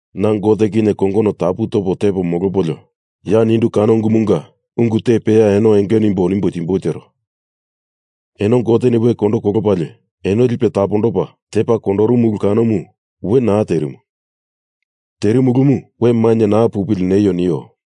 Na Gote kinye kongono tapu topo tepo molopolio ya nindu ungu kanomunga ungu te peya eno enge nimbo nimboi tero. Eno Goteni we kondo kolopalie eno lipe tapondopa tepa kondorumu ulu kanomu we naa terimu, terimu ulumu we mainye naa pupili neio nio.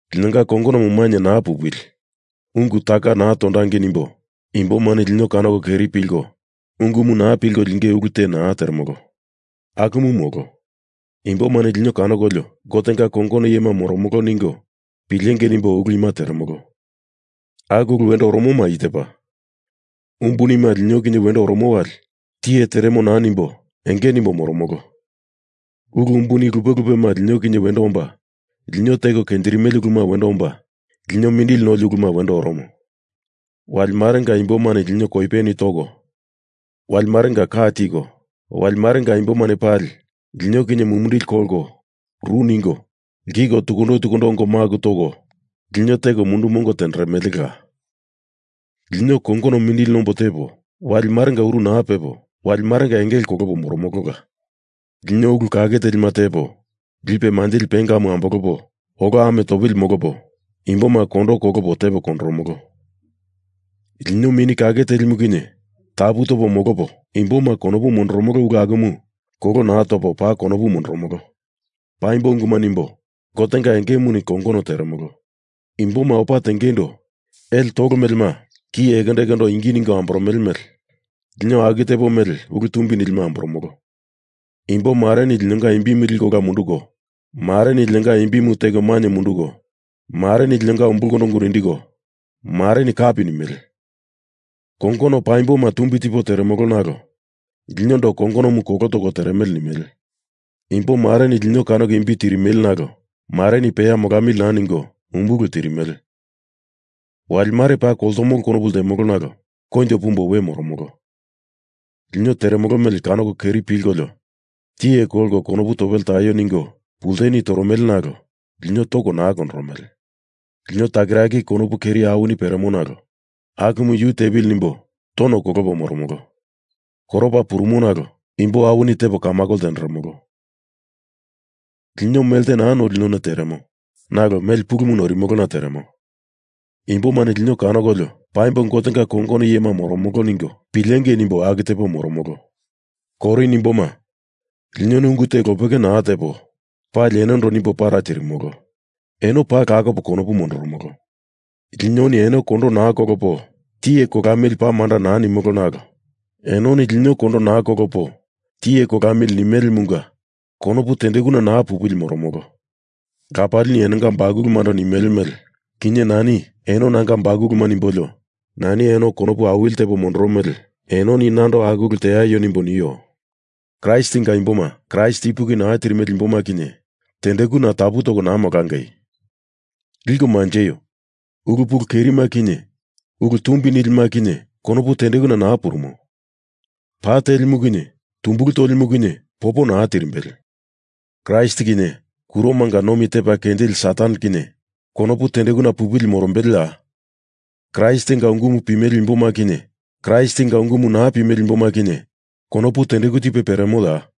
Linonga kongonomu mainye naa pupili, ungu taka naa tondangei nimbo imbomani lino kanoko keri pilko ungumu naa pilko linge ulu te naa teremolo. Akumu molo. Imbomani lino kanokolio Gotenga kongono iyema moromolo ningo pilengei nimbo ulu ima teremolo. Aku ulu wendo oromoma i tepa. Umbunima lino kinye wendo oromo wali tiye teremo naa nimbo enge nimbo moromolo. Ulu umbuni lupe lupema lino kinye wendo omba, lino teko kenjirimele uluma wendo omba, lino mindili noli uluma wendo oromo. Wali marenga imbomani lino koipeni toko, wali marenga ka tiko, wali marenga imbomani pali lino kinye mumindili kolko ru ningo lkiko tukundo tukundo ongo maku toko lino teko mundu mongo tenderemelela. Lino kongono mindili nombo tepo, wali marenga uru naa pepo, wali marenga engele kolopo moromolola. Lino ulu kake telima tepo, lipe manjili pengamu ambolopo, olo ame topili molopo, imboma kondo kolopo tepo kondoromolo. Lino Mini Kake Telimu kinye tapu topo molopo, imboma konopu mondoromolo ulu akumu kolo naa topo paa konopu mondoromolo. Paimbo unguma nimbo, Gotenga engemuni kongono teremolo. Imboma opa tengeindo ele tolo melema ki ekondo ekondo ingi tiko amboromele mele lino aku tepo mele ulu tumbi nilima amboromolo. Imbo mareni linonga imbimu liko ola munduko, mareni linonga imbimu teko mainye munduko; mareni linonga ungu umbulkondo nindiko, mareni kapi nimele. Kongono paimboma tumbi tipo teremolo nalo linondo kongonomu kolo toko teremele nimele. Imbo mareni lino kanoko imbi tirimele nalo mareni peya molamili naa ningo, umbulu tirimele. Wali mare paa koltomolo konopu ltemolo nalo koinjo pumbo we moromolo. Lino teremolo mele kanoko keri pilkolio tiye kolko konopu topele taio ningo pulteni toromele nalo lino toko naa kondoromele. Lino takiraki konopu keri awini peremo nalo akumu yu tepili nimbo tono kolopo moromolo. Koropa purumo nalo imbo awini tepo kamakoma ltenderemolo. Lino melte naa noili none teremo, nalo mele pulumu noirimolona teremo. Imbomani lino kanokolio paimbo Gotenga kongono iyema moromolo ningo pilengei nimbo aku tepo moromolo. Korin imboma, linoni ungu te lopeke naa tepo, pali enondo nimbo para tirimolo. Eno paa lakopo konopu mondoromolo. Linoni eno kondo naa kolopo tiye kolamili paa manda naa nimolo nalo enoni lino kondo naa kolopo tiye kolamili nimelemunga konopu tendekuna naa pupili moromolo. Lapalini enonga bakulumando nimele mele, kinye nani eno nanga bakuluma nimbolio nani eno konopu awili tipo mondoro mele enoni nando aku ulu teaio nimbo nio. Kraistinga imboma Kraist ipuki naa tirimele imboma kinye tendekuna tapu toko naa molangei. Liko manjeio. Ulu pulu kerima kinye ulu tumbi nilima kinye konopu tendekuna naa purumo. Pa telimu kinye tumbulu tolimu kinye popo naa tirimbele. Kraist kinye kuromanga nomi tepa kenjili Satan kinye konopu tendekuna pupili morombeleya? Kraistinga ungumu pimele imboma kinye Kraistinga ungumu naa pimele imboma kinye konopu tendeku tipe peremoya?